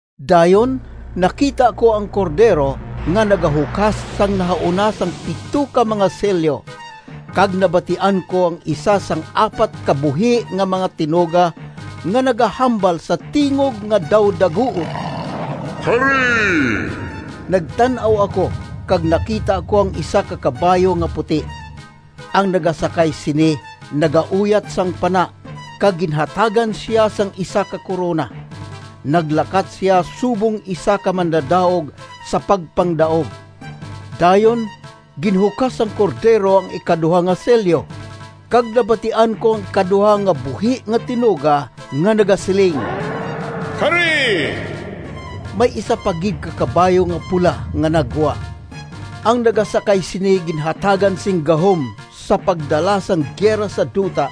Dayon nakita ko ang Cordero nga nagahukas sang nahauna sang pito ka mga selyo, kag nabatian ko ang isa sang apat ka buhi nga mga tinuga nga nagahambal sa tingog nga daw daguob, “Kari!” Nagtan-aw ako kag nakita ko ang isa ka kabayo nga puti. Ang nagasakay sini nagauyat sang pana, kag ginhatagan sia sing isa ka korona. Naglakat sia subong isa ka mandadaog sa pagpangdaog. Dayon ginhukas sang Cordero ang ikaduha nga selyo, kag nabatian ko ang ikaduha nga buhi nga tinuga nga nagasiling, “Kari!” May isa pa gid ka kabayo nga pula nga naggwa. Ang nagasakay sini ginhatagan sing gahom sa pagdala sang gira sa duta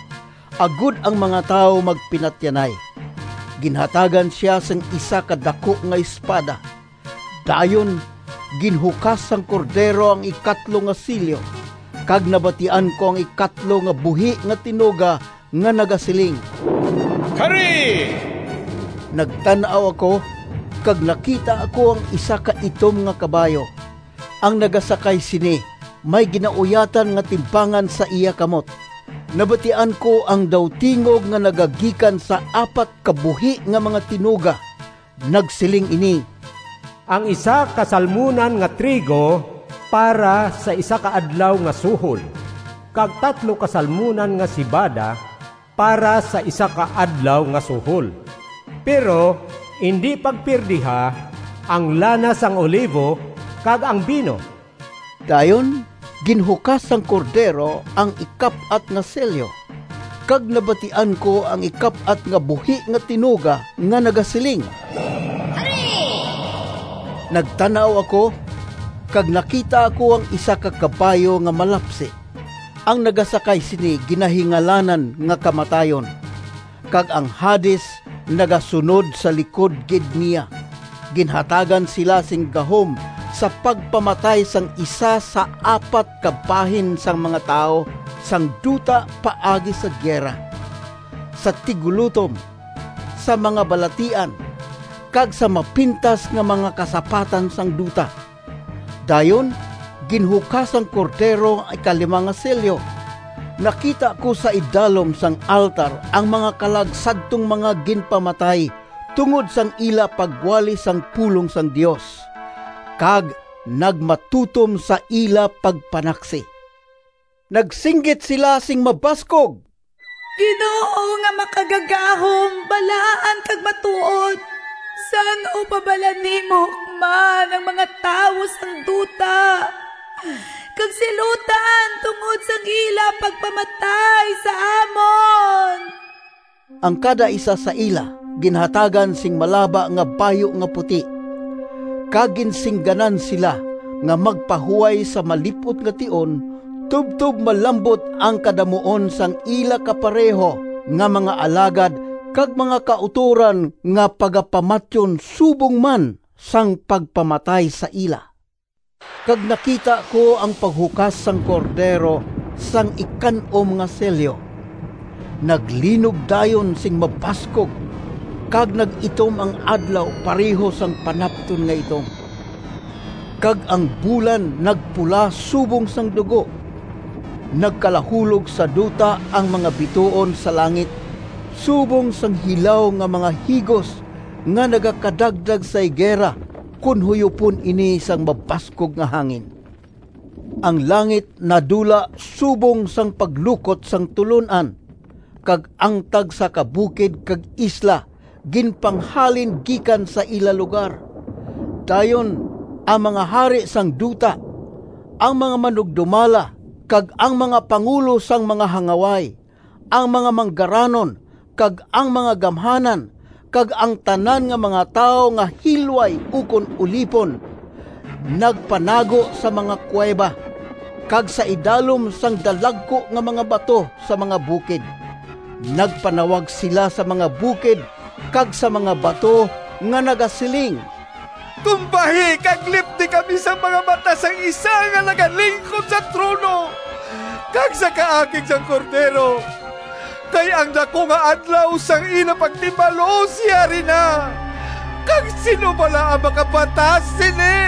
agod ang mga tawo magpinatyanay. Ginhatagan sia sing isa ka daku nga espada. Dayon ginhukas sang Cordero ang ikatlo nga selyo, kag nabatian ko ang ikatlo nga buhi nga tinuga nga nagasiling, “Kari!” Nagtan-aw ako, kag nakita ko ang isa ka itom nga kabayo. Ang nagasakay sini may ginauyatan nga timbangan sa iya kamot. Nabatian ko ang daw tingog nga nagagikan sa apat ka buhi nga mga tinuga. Nagsiling ini, “Ang isa ka salmunan nga trigo para sa isa ka adlaw nga suhol, kag tatlo ka salmunan nga sebada para sa isa ka adlaw nga suhol. Pero indi pagpiyerdiha ang lana sang olivo kag ang bino!” Dayon ginhukas sang Cordero ang ikap-at nga selyo, kag nabatian ko ang ikap-at nga buhi nga tinuga nga nagasiling, “Kari!” Nagtan-aw ako, kag nakita ko ang isa ka kabayo nga malapsi. Ang nagasakay sini ginahingalanan nga Kamatayon, kag ang Hades nagasunod sa likod gid niya. Ginhatagan sila sing gahom sa pagpamatay sang isa sa apat ka bahin sang mga tawo sang duta paagi sa gira, sa tiggulotom, sa mga balatian, kag sa mapintas nga mga kasapatan sang duta. Dayon ginhukas sang Cordero ang ikalima nga selyo. Nakita ko sa idalom sang altar ang mga kalag sadtong mga ginpamatay tungod sang ila pagwali sang pulong sang Dios, kag nagmatutom sa ila pagpanaksi. Nagsinggit sila sing mabaskog, “Ginoo nga Makagagahom, balaan kag matuod! San-o pa bala nimo hukman ang mga tawo sang duta, kag silutan tungod sang ila pagpamatay sa amon?” Ang kadaisa sa ila ginhatagan sing malaba nga bayu nga puti, kag ginsingganan sila nga magpahuway sa malip-ot nga tion tubtob malambot ang kadamuon sang ila kapareho nga mga alagad kag mga kautoran nga pagapamatyon subong man sang pagpamatay sa ila. Kag nakita ko ang paghukas sang Cordero sang ikan-om nga selyo. Naglinog dayon sing mabaskog kag nag-itom ang adlaw pareho sang panapton nga itom, kag ang bulan nagpula subong sang dugo. Nagkalahulog sa duta ang mga bituon sa langit, subong sang hilaw nga mga higos nga nagakadagdag sa higera, kon huyopon ini sang mabaskog nga hangin. Ang langit nadula subong sang paglukot sang tulon-an, kag ang tagsa ka bukid kag isla ginpanghalin gikan sa ila lugar. Dayon ang mga hari sang duta, ang mga manugdumala kag ang mga pangulo sang mga hangaway, ang mga manggaranon kag ang mga gamhanan, kag ang tanan nga mga tawo nga hilway ukon ulipon, nagpanago sa mga kuweba, kag sa idalom sang dalagku nga mga bato sa mga bukid. Nagpanawag sila sa mga bukid kag sa mga bato nga nagasiling, “Tumbahi kag lipdi kami sa mga mata sang isa nga nagalingkod sa trono, kag sa kaakig sang Cordero! Kay ang daku nga adlaw sang ila pagtimalos yari na, kag sin-o bala ang makabatas sini?”